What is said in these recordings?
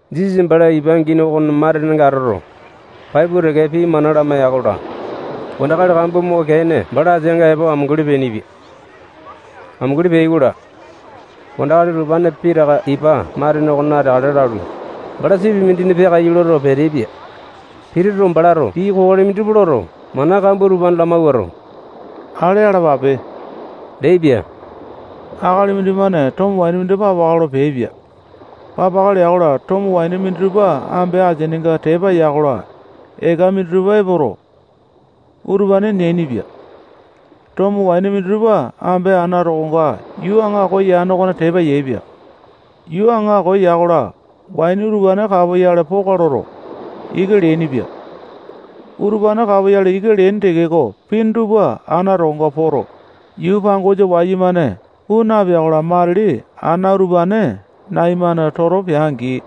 Jisasa bala ipa angini okona matenenga atoto, pai pua teke pii mana lamaiya-kola, wandakali kambua moke-ene bala ateanga epo amunguli peainipia. Amunguli peai-kola, wandakali utupane pitaka ipa matene okona ateakale lalu, bala sipi mindina peakaiyu loto, peteaipia. Pituto, balato pii kokoli minditupa loto, mana kambua utupane lamawuato, ale alapape leaipia. Akali mindimane tomo waini papaka lolo peaipia. Papaka lea-kola, tomo waini minditupa ambe asininga tepa ya-kola, eka minditupa epoto, utupane neainipia. Tomo waini minditupa ambe ana tokonga yuu aŋako yane okona tepa yaepia. Yuu aŋako ya-kola, waini utupane kapoyale poka loto, ika leainipia. Utupane kapoyale ika leaini tekeko, pini tupa ana tokonga poto, yuu pangosa wayumane puu napea-kola, matili ana utupane nai-mane toto pea-angi,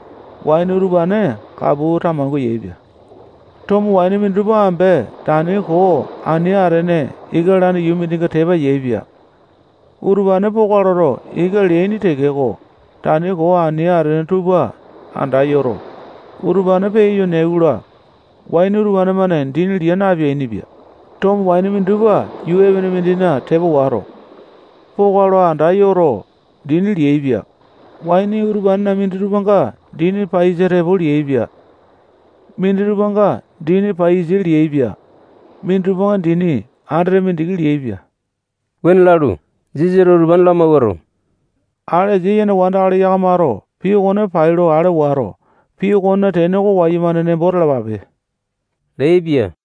waini utupane kapu tamangua yaepia. Tomo waini minditupa ambe tani koo ani atene ika lalane yuu mindina tepa yaepia. Utupane poka loto, ika leaini tekeko, tani koo ani atene tupa anda yoto, utupane peyayo neai-kola, waini utupane-mane dini lia napeainipia. Tomo waini minditupa yuu epene mindina tepa wato, poka lo anda yoto, dini liaepia. Waini utupanena minditupanga dini paiyasa tepo liaepia. Minditupanga dini paiyasa liaepia. Minditupanga dini andete mindiki liaepia. Wuane lalu, Jisasato utupane lamawuato, ale asia yene wandakali yakamato pii okone pai lo ale wato, pii okonena tene oko wayumane nembo talapape leaipia.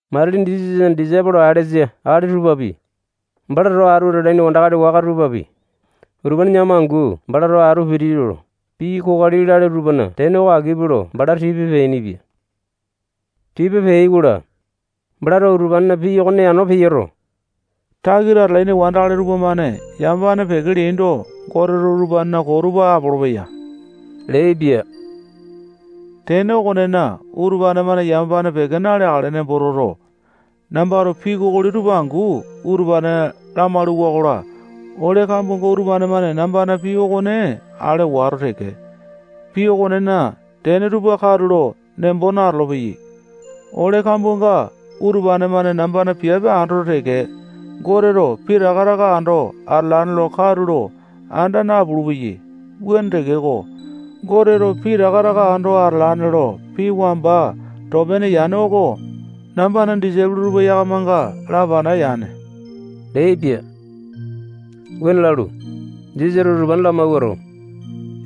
Matili Jisasana disaipolo alesa akali tupapi, bala towa atu atalaini wandakali waka tupapi, utupane yakama angu bala towa atu pituto, pii kokoli lale tupana tene oko akipe lo bala tipa peainipia. Tipa peai-kola, balato utupanena pii okone yano peyoto, takita atalaini wandakali tupamane yamapane peke leaindo, Goteto utupanena koo tupa apolopeya leaipia. Tene okonena, utupane-mane yamapane peke naleakale nembo toto, nambato pii kokoli tupa angu utupane lamalu-wakola, ole kambuanga utupane-mane nambana pii okone ale wato teke, pii okonena tene tupa katulo nembo natolo-peyai. Ole kambuanga utupane-mane nambana piape andoto teke, Goteto pitaka taka ando atalane lo katulo anda napulu-peyai. Wuane tekeko, Goteto pitaka taka ando atalane lo pii wamba too pene yane oko nambana disaipolo tupa yakamanga lapana yane leaipia. Wuane lalu, Jisasato utupane lamawuato,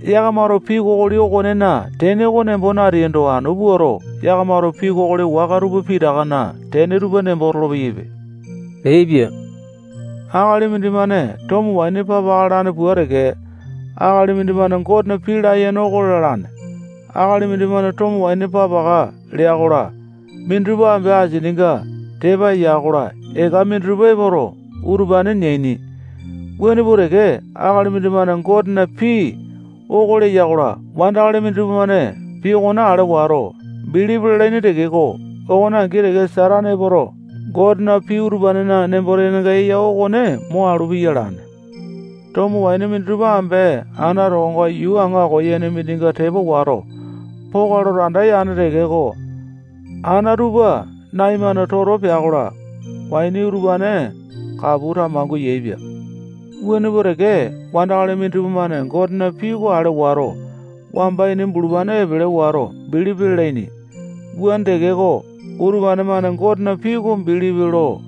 yakamato pii kokoli okonena tene oko nembo nateaindo, anu puato, yakamato pii kokoli waka tupa pitakana tene tupa nembo tolopeyaipe leaipia. Akali mindimane tomo waini papaka lalane pua teke, akali mindimane Gotena pii layene oko lalane. Akali mindimane tomo waini papaka lea-kola, minditupa ambe asininga tepa ya-kola, eka minditupa epoto, utupane neaini. Wuane pua teke, akali mindimane Gotena pii oko leya-kola, wandakali minditupa-mane pii okone ale wato, bilipi lalaini tekeko, okone angi teke Satane epoto, Gotena pii utupanena nembo-tenenga eya okone mo alu piya alane. Tomo waini minditupa ambe ana tokonga yuu aŋako yane mindina tepa wato, poka loto, anda yane tekeko, ana tupa nai-mane toto pea-kola, waini utupane kapu tamangua yaepia. Wuane pua teke, wandakali minditupa-mane Gotena pii oko ale wato, wamba ini bulupane epele wato, bilipi lalaini. Wuane tekeko, utupane-mane Gotena pii oko bilipi lo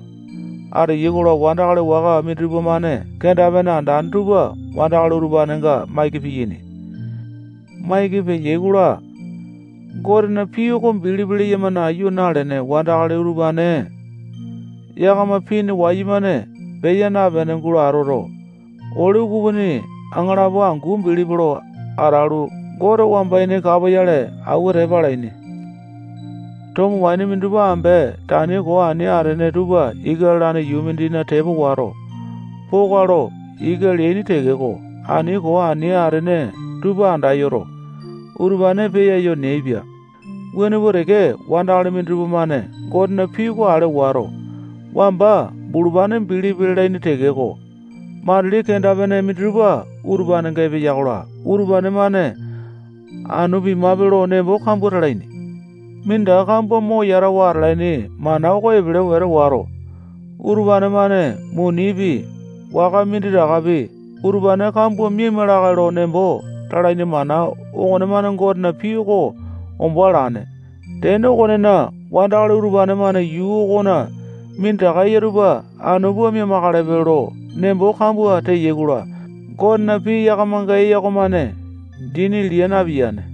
ateyai-kola, wandakali waka minditupa-mane kenda-pene andane tupa wandakali utupanenga maiki piyaini. Maiki peyai-kola, Gotena pii oko bilipi leyama nayu nalene wandakali utupane yakama pini wayumane peya napene gulo atoto, ole ukupini aŋalapo angu bilipi lo atalu, Gote wamba ini kapoyale awua tepa alaini. Tomo waini minditupa ambe tani koo ani atene tupa ika lalane yuu mindina tepa wato, poka lo ika leaini tekeko, tani koo ani atene tupa andayoto, utupane peyayo neaipia. Wuane pua teke, wandakali minditupa-mane Gotena pii oko ale wato, wamba bulupane bilipi lalaini tekeko, matili kenda-pene minditupa utupanenga epeya-kola, utupane-mane anu pimape lo nembo kambua talaini. Minditaka kambua mo yatawa atalaini mana oko epele wete wato, utupane-mane munipi, waka minditakapi, utupane kambua miaima lakae lo nembo talaini mana okonemane Gotena pii oko ombo alane. Tene okonena, wandakali utupane-mane yuu okona minditaka eya tupa anu pua mia-makalepe lo nembo kambua teyai-kola, Gotena pii yakamanga eya okomane dini lia napiyane.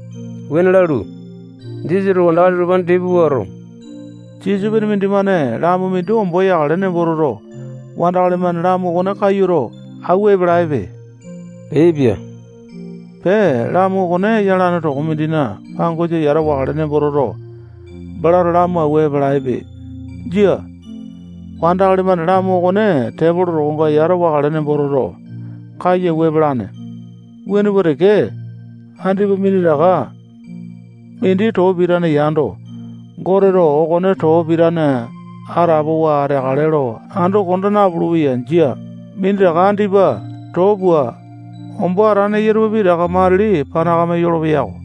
Wuane lalu, Jisasato wandakali utupane tipa puato, sisopene mindimane lamu mindi ombo yakale nembo toto, wandakali-mane lamu okone kayuto, awua epalaepe leaipia. Pee, lamu okone yalane toko mindina pangosa yata wakale nembo toto, balato lamu awua epalaepe. Jia. Wandakali-mane lamu okone tepolo tokonga yata wakale nembo toto, kayu awua epalane. Wuane pua teke, andipa minditaka mindi too pitane yando, Goteto okone too pitane atapowa ateakale lo ando konda napulu-peya. Jia. Minditaka andipa too pua, ombo atane eya tupa pitaka matili panakame yolopeya-ko.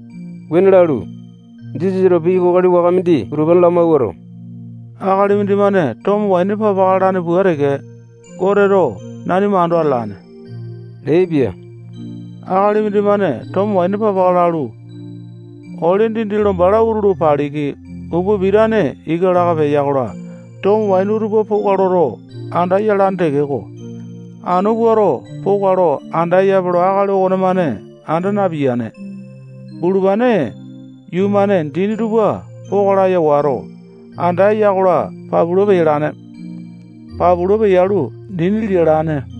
Wuane lalu, Jisasato pii kokoli waka mindi utupane lamawuato, akali mindimane tomo waini papaka lalane pua teke, Goteto nanima ando atalane leaipia. Akali mindimane tomo waini papaka lalu, ole dindi lo bala utulu paliki, upa pitane ika laka, peya-kola, tomo waini utupa poka loto, anda yalane tekeko, anu puato, poka lo anda eyape lo akali okonemane anda napiyane. Bulupane yuu-mane dini tupa poka laya wato, anda eya-kola, papula peyalane. Papula peyalu, dini lialane.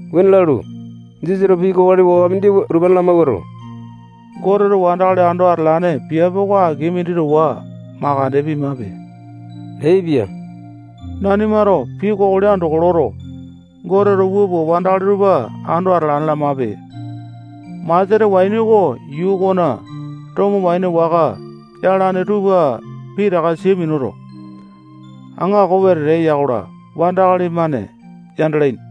Wuane lalu, Jisasato pii kokoli waka mindi utupane lamawuato, Goteto wandakali ando atalane piape oko aki mindi towa makande pimape leaipia. Nanimato pii kokoli andoko loto, Goteto wua pua, wandakali tupa ando atalane lamape. Maseta waini oko yuu okona tomo waini waka yalane tupa pitaka sia minuto, aŋako wete eya-kola, wandakali-mane yandalaini.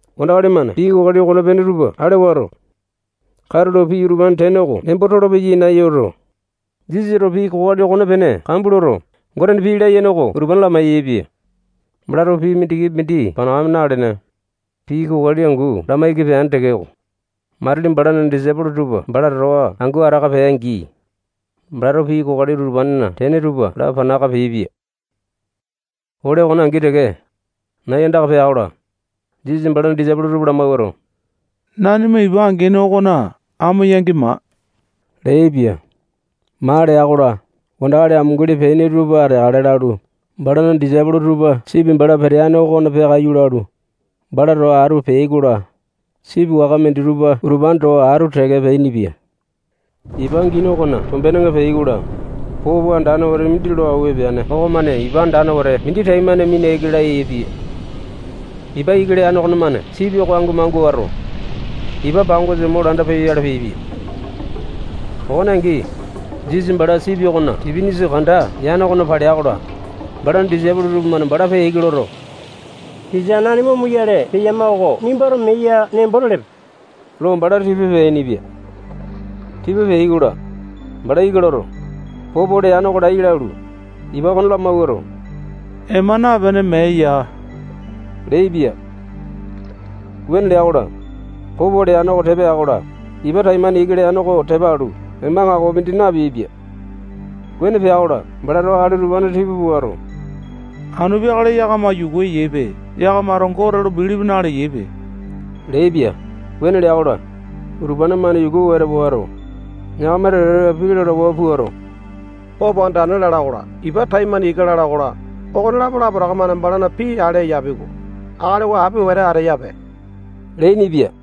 Wandakali-mane pii kokoli okonepene tupa ale wato, katulo pii utupanena tene oko nembo tolopeyai nayuto, Jisasato pii kokoli okonepene kambua loto, Gotena pii layene oko utupane lamai-yaepia. Balato pii mindikipi mindi panakame nalene, pii kokoli angu lamaiki peane tekeko, matili balana disaipolo tupa bala towa angu ataka peai-angi, balato pii kokoli utupanena tene tupa lapana aka peaipia. Ole okone angi teke, nai andaka pea-kola, Jisasato balana disaipolo tupa lamawuato, nanima ipa angini okona amo yangi maa leaipia. Maa lea-kola, wandakali amunguli peaini tupa ateakale lalu, balana disaipolo tupa sipi bala peteane okona peakaiyu lalu, bala towa atu peai-kola, sipi waka minditupa utupane towa atu teke peainipia. Ipa angini okona tombenenga peai-kola, popo andane wete mindi lo awua epeane okomane ipa andane wete mindi taimane mina ika laya yaepia. Ipa ika leane okonemane sipi oko ango mangua wato, ipa pangosa mo landa peyoyale peaipia. Okone angi, Jisasa bala sipi okona tipinisa kanda yane okona palea-kola, balana disaipolo tupamane bala peya ika loto, tisa, nanima omoyale peyama oko nimbato mee ya nembo telepe lo bala tipa peainipia. Tipa peai-kola, bala ika loto, popo leane oko laiya lalu, ipa okone lamawuato, ema napene, mee yaa leaipia. Wuane lea-kola, popo leane oko tepa ya-kola, ipa taimane ika leane oko tepa alu, ema aŋakopi mindi napeaipia. Wuane pea-kola, balato akali utupane tipa puato, anu peakale yakama yuku eyaipe. Yakamato Gote lo bilipi naleyaipe leaipia. Wuane lea-kola, utupane-mane yuku wete wato, yakama teke-teke pii lalawa puato, popo andane lala okola, ipa taimane ika lala okola, okonelapo lapotaka-mane balana pii ale eyapi-ko. Akali oko api wete ateyape leainipia.